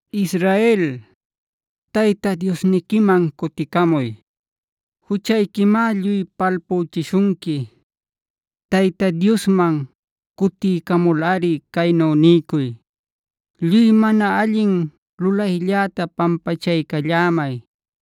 Israel, Tayta Diosniquiman cuticamuy. Juchayquimá lluy palpüchishunqui. Tayta Diosman cutiycamulꞌari caynu niycuy: “Lluy mana allin lulaylläta pampachaycallämay.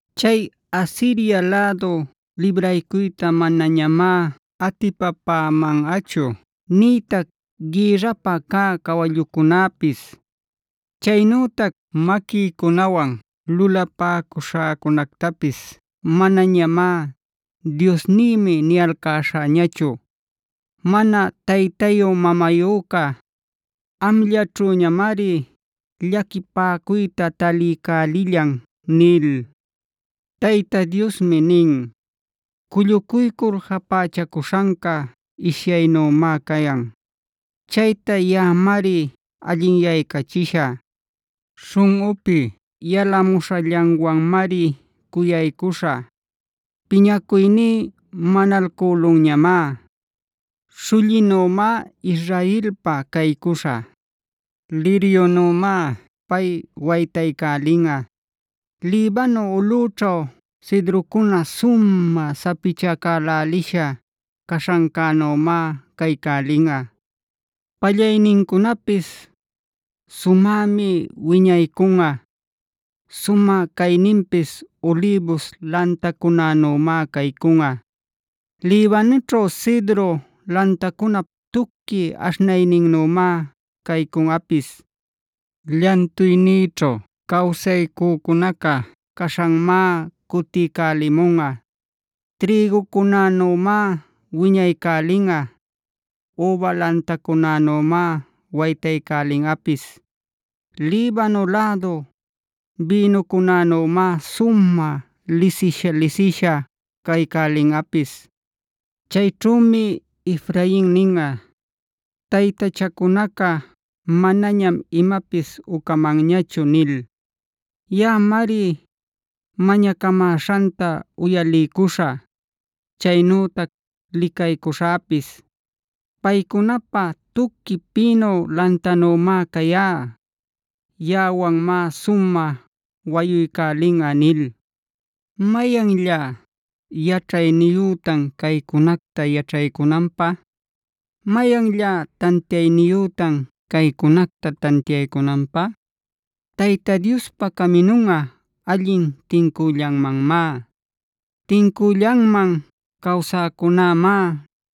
Chay Asiria lädu libraycuyta manañamá atipapämanꞌachu nïtac gïrrapä cä cawallücunapis. Chaynütac maquïcunawan lulapäcuśhäcunactapis manañamá ‘diosnïmi’ niyalcäśhäñachu. Mana taytayu-mamayüca amllaćhüñamari llaquipaycuyta taliycälillan” nil. Tayta Diosmi nin: “Cullucuycul japächacuśhanca ishyaynümá cayan; chayta yaꞌamari allinyaycachishä. Śhunꞌüpi yalamuśhallanwanmari cuyaycuśhä. Piñacuyní manalcülunñamá. Śhullinümá Israelpa caycuśhä. Liryunümá pay waytaycälinꞌa. Libano ulꞌüćhu cedrocuna sumä sapichacälälisha caśhancänümá caycälinꞌa. Pallaynincunapis sumämi wiñaycunꞌa. Sumä cayninpis ulïbus lantacunänümá caycunꞌa. Libanoćhu cedro lantacunap tuqui aśhnayninnümá caycunꞌapis. Llantuynïćhu cawsäcunaca caśhanmá cutiycälimunꞌa. Trïgucunänümá wiñaycälinꞌa. Üba lantacunänümá waytaycälinꞌapis. Libano lädu bïnucunänümá sumä lisisha-lisisha caycälinꞌapis. Chayćhümi Efrain ninꞌa: ‘Taytachacunaca manañam imapis ucamanñachu’ nil. Yaꞌañamari mañacamäśhanta uyaliycuśhä, chaynütac licaycuśhäpis. Paycunapä tuqui pïnu lantannümá cayá. Yaꞌawanmá sumä wayuycälinꞌa” nil. ¿Mayanllá yaćhayniyütan caycunacta yaćhaycunanpä? ¿Mayanllá tantiayniyütan caycunacta tantiaycunanpä? Tayta Diospa caminunꞌa allin tincüllanmanmá. Tincüllanman cawsäcunämá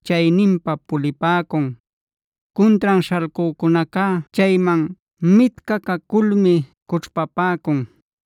chayninpa pulipäcun. Cuntran śhalcücunacá chayman mitcacaculmi cućhpapäcun.